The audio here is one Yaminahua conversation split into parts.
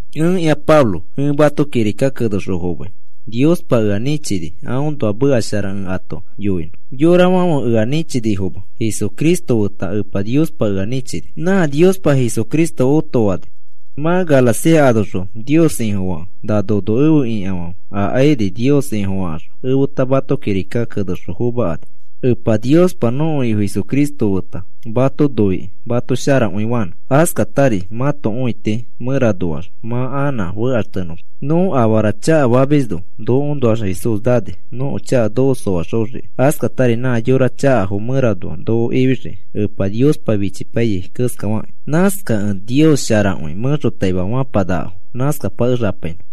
Ẽkĩa Pablo, ẽ mato kirika kenexõ fomai. Niospa ea nĩchini aõnoa meka shara ẽ ato yoinõ. Yorafãfe ea nĩchinifoma, Jesucristo feta Epa Niospa ea nĩchini. Nã Niospa Jesucristo otofani mã nakẽ. Mã Galacia anoxõ Nios Ifofakẽ, na nono efe ikafãfe, akairi Nios Ifofakaxõ efeta mato kirika kenexõ fomakani. Epa Niospa nõko Ifo Jesucristo feta mato noikĩ mato sharakõi fanõ. Askatari mãto õiti mẽranoax mã anã fekaxtenõma. Nõ afara chakafamisno nokoõnoax Jesús nani nõko chaka noko soaxoxiki, askatari nã yorafo chakafo mẽranoa noko ifixiki Epa Niospa fichipaiyai keskafakĩ. Nãskakẽ Nios sharakõi mẽxotaima fapanakafo. Nãskapakexapainõ.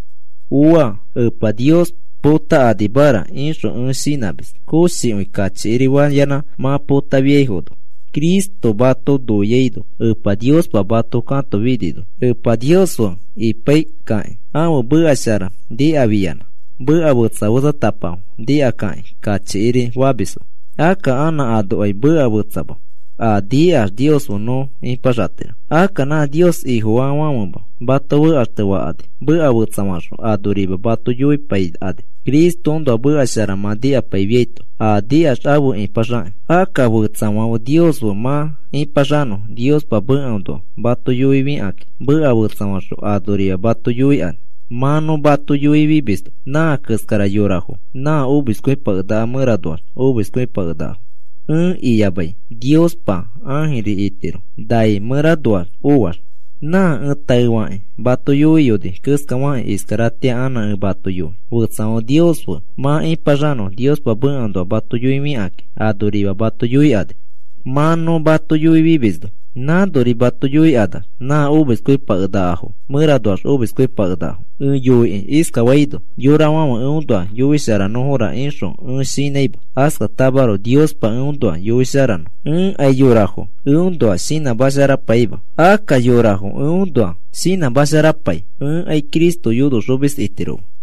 Ooa. Epa Nios potakanimara ixõ ẽ shinãmis, koshikõi kachikiri fayanã mã potafiaino, Cristo mato noiaino Epa Niospa mato katofinino. Epa Nios fe ipaikakĩ ãfe meka shara nikafiyanã, meka fetsa fetsatapafo nikakakĩ kachikiri famisfo. Akka anã anokai meka fetsama, a nikax Nios fe nõ ipaxatiro. Akka nã Nios Ifofaafãfema mato fekaxtefakani. Meka fetsafaxõ anorima mato yoipaikani, Cristoõnoa meka shara mã nikapaifiaito a nikax afe ipaxakĩ. Akka fetsafãfe Nios fe mã ipaxanõ Niospa mekaõnoa mato yoifikakĩ, meka fetsafaxõ anorima mato yoikani, mã nõ mato yoifimisno. Nã keskara yorafo nã omiskõipakenakafo mẽranoax omiskõipakenakafo, ẽ iyamai Niospa ãjiri itiro nai mẽranoax oax. Nã ẽ taefakĩ mato yoiyoni keskafakĩ, iskaratĩa anã ẽ mato yoi. Fetsafãfe Nios fe mã ipaxanõ Niospa mekaõnoa mato yoifikakĩ anorima mato yoikani, mã nõ mato yoifimisno. Nãnori mato yoikanax nã omiskõipakenakafo mẽranoax omiskõipakenakafo. Ẽ yoiki iskafaino, yorafãfe eõnoa yoisharanõfora ixõ ẽ shinãima, askatamaroko Niospa eõnoa yoisharanõ. Ẽkai yorafo eõnoa shinãmasharapaima. Akka yorafo eõnoa shinãmasharapai, ẽkai Cristo yonoxomis itiroma.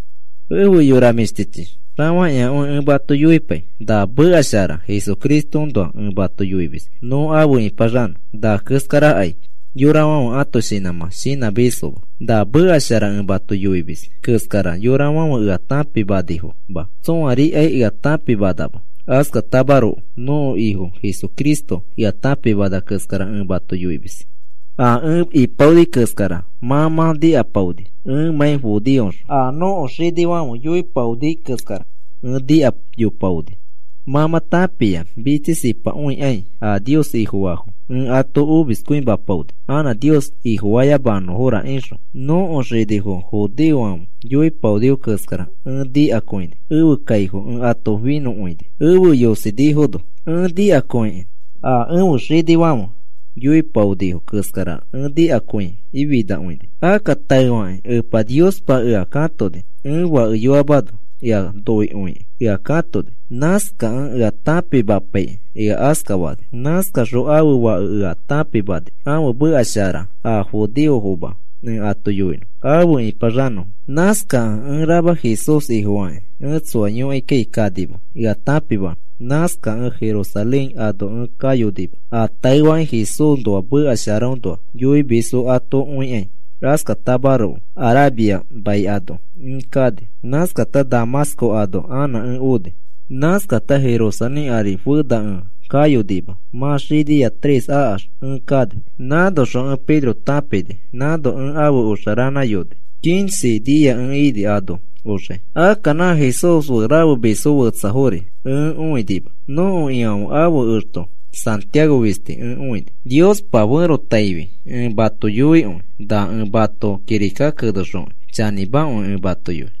Efe yora mĩshtichi, xafakĩakõi ẽ mato yoipai. Na meka shara Jesucristoõnoa ẽ mato yoimis nõ afe ipaxanõ. Na keskarakai yorafãfe ãto shinãmã shinãmisfoma. Na meka shara ẽ mato yoimis keskara yorafãfe ea tãpimanifoma. Tsõarikai ea tãpimanama. Askatamaroko nõko Ifo Jesucristo ea tãpimana keskara ẽ mato yoimis. A ẽ ipaoni keskara mã mã nikapaoni. Ẽmãi judeoxõ a nõko xinifãfe yoipaoni keskara ẽ nikayopaoni. Mã mã tãpia mitsisipakõikai a Nios Ifofaafo ẽ ato omiskõimapaoni, anã Nios Ifofayamanõfora ixõ. Nõko xinifo judeofãfe yoipaonifo keskara ẽ nikakõini, ẽfe kaifofo ẽ ato finõkõini, efe yosifinifono. Ẽ nikakõikĩ a ẽfe xinifãfe yoipaonifo keskara ẽ nikakĩ finakõini. Akka taefakĩ Epa Niospa ea katoni ẽ fakeyoamano. Ea noikõikĩ ea katoni. Nãskakẽ ea tãpimapaikĩ ea askafani. Nãskaxõ ãfe Fake ea tãpimani ãfe meka shara a judeofoma ẽ ato yoinõ afe ipaxanõfo. Nãskakẽ ẽ rama Jesús Ifofakĩ ẽ tsoa yõkaikai kanima ea tãpimanõ. Nãskakẽ Jerusalén ano ẽ kayonima a taefakĩ Jesúsnoa meka sharaõnoa yoimisfo ato õikai. Askatamaroko Arabia mai ano ẽ kani. Nãskata Damasco ano anã ẽ oni. Nãskata Jerusalén ari fena ẽ kayonima, mã xinia tres akax ẽ kani. Nãnoxõ ẽ Pedro tãpini, nãno ẽ afe oxa ranãyoni quince nia ẽ ini ano oxai. Akka nã Jesús fe rafemisfo fetsafori ẽ õinima. Nõko Ifãfe ãfe exto Santiago fisti ẽ õini. Niospa ferotaifi ẽ mato yoikõi, na ẽ mato kirika kenexokĩ chanĩmakõi ẽ mato yoi.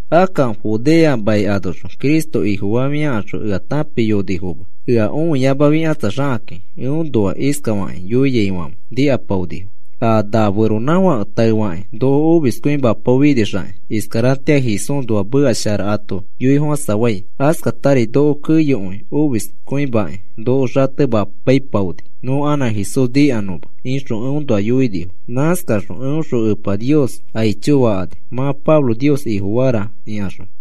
Akka Judea mai anoxõ Cristo Ifofafiakaxõ ea tãpiayonifoma. Ea õiyamafikatsaxakakĩ eõnoa iskafakĩ yoiaifãfe nikapaonifo: “A na feronãfãke taefakĩ noko omiskõimapaofinixaki, iskaratĩa Jesúsnoa meka shara ato yoifofãsafai. Askatari noko keyokõi omiskõimakĩ noko xatemapaipaoni nõ anã Jesús nikanõma,” ixõ eõnoa yoinifo. Nãskaxõ eõxõ Epa Nios aicho fakani, mã Pablo Nios Ifofara ikaxõ.